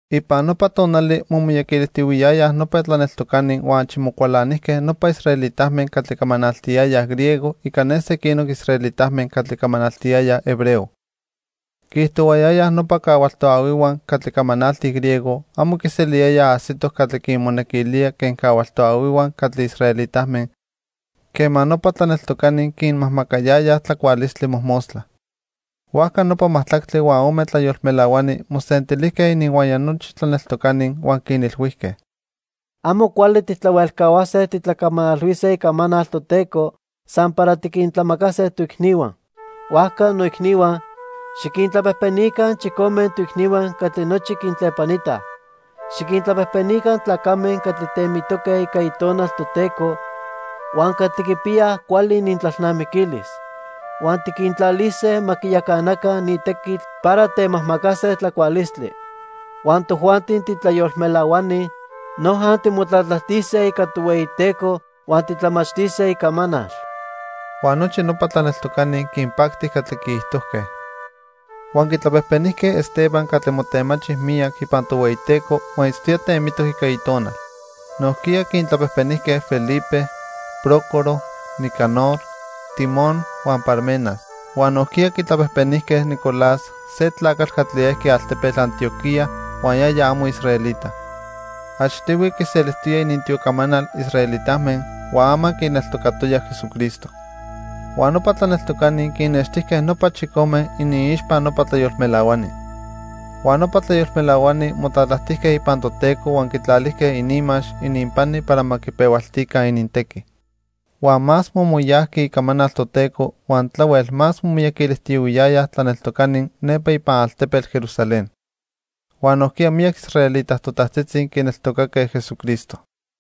Ipan nopa tonali momiyaquilijtiyohuiyayaj nopa tlaneltocani huan achi mocualanijque nopa israelitame catli camanaltiyayaj griego ica ne sequinoc israelitame catli camanaltiyayaj hebreo. Quiijtohuayayaj nopa cahual toahuihua catli camanaltij griego amo quiseliyayaj ajsitoc catli quinmonequilía quen cahual toahuihua catli israelitame quema nopa tlaneltocani quinmajmacayayaj tlacualistli mojmostla. Huajca nopa majtlactli huan ome tlayolmelahuani mosentilijque ininhuaya nochi tlaneltocani huan quinilhuijque: —Amo cuali tijtlahuelcahuase titlacamanalhuise Icamanal Toteco san para tiquintlamacase toicnihua. Huajca, noicnihua, xiquintlapejpenica chicome toicnihua catli nochi quintlepanitaj. Xiquintlapejpenica tlacame catli temitoque ica Itonal Toteco huan catli quipiyaj cuali inintlalnamiquilis. Huan tiquintlalise ma quiyacanaca ni tequitl para temajmacase tlacualistli. Huan tojuanti titlayolmelahuani, noja timotlatlajtise ica Tohueyiteco huan titlamachtise Icamanal. Huan nochi nopa tlaneltocani quinpacti catli quiijtojque. Huan quitlapejpenijque Esteban catli motemachi miyac ipan Tohueyiteco huan itztoya temitoc ica Itonal. Nojquiya quintlapejpenijque Felipe, Prócoro, Nicanor, Timón huan Parmenas. Huan nojquiya quitlapejpenijque Nicolás se tlacatl catli ejqui altepetl Antioquía huan yaya amo israelita. Achtihui quiselijtoya inintiocamanal israelitame huan ama quineltocatoya Jesucristo. Huan nopa tlaneltocani quinnextijque nopa chicome iniixpa nopa tlayolmelahuani. Huan nopa tlayolmelahuani motlatlajtijque ipan Toteco huan quitlalijque ininmax ininpani para ma quipehualtica inintequi. Huan más momoyajqui icamanal Toteco huan tlahuel más momiyaquilijtiyohuiyayaj tlaneltocani nepa ipan altepetl Jerusalén. Huan nojquiya miyac israelita totajtzitzi quineltocaque Jesucristo.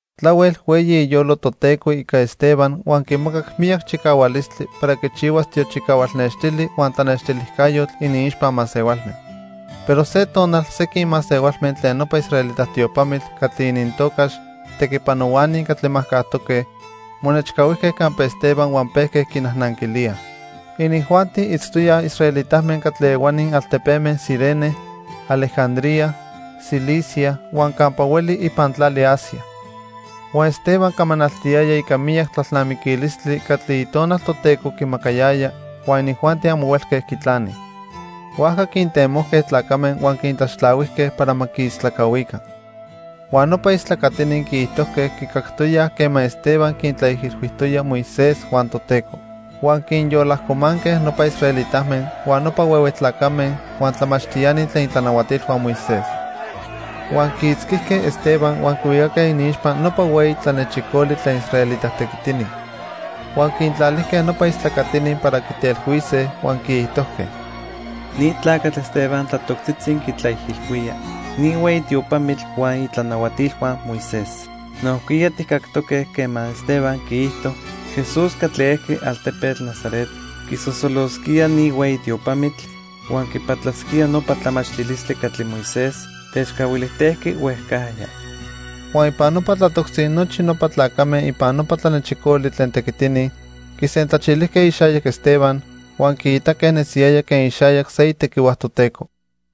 Tlahuel hueyi iyolo Toteco ica Esteban huan quimacac miyac chicahualistli para quichihuas tiochicahual nextili huan tlanextilijcayotl iniixpa masehualme. Pero se tonal sequin masehualme tlen nopa israelita tiopamitl catli inintocax Tequipanohuani Catli Majcajtoque monechcahuijque campa Esteban huan pejque quinajnanquilíaj. Inijuanti itztoyaj israelitame catli ehuani altepeme Cirene, Alejandría, Cilicia huan campa hueli ipan tlali Asia. Huan Esteban camanaltiyaya ica miyac tlalnamiquilistli catli Itonal Toteco quimacayaya huan inijuanti amo huelque quitlanij. Huajca quintemojque tlacame huan quintlaxtlahuijque para ma quiistlacahuica. Huan nopa istlacatini quiijtojque quicactoyaj quema Esteban quintlaijilhuijtoya Moisés huan Toteco. Huan quinyolajcomanque nopa israelitame, huan nopa huehue tlacame, huan tlamachtiani tlen itlanahuatilhua Moisés. Huan quiitzquijque Esteban huan quihuicaque iniixpa nopa hueyi tlanechicoli tlen israelita tequitini. Huan quintlalijque nopa istlacatini para quitelhuise huan quiijtojque: —Ni tlacatl Esteban tlatoctzitzi quitlaijilhuía ni hueyi tiopamitl huan itlanahuatilhua Moisés. Nojquiya tijcactoque quema Esteban quiijto Jesús catli ejqui altepetl Nazaret quisosolosquía ni hueyi tiopamitl huan quipatlasquía nopa tlamachtilistli catli Moisés techcahuilijtejqui huejcajya. Huan ipan nopa tlatoctzi nochi nopa tlacame ipan nopa tlanechicoli tlen tequitini quisentlachilijque ixayac Esteban, huan quiitaque nesiyaya quen ixayac se itequihua Toteco.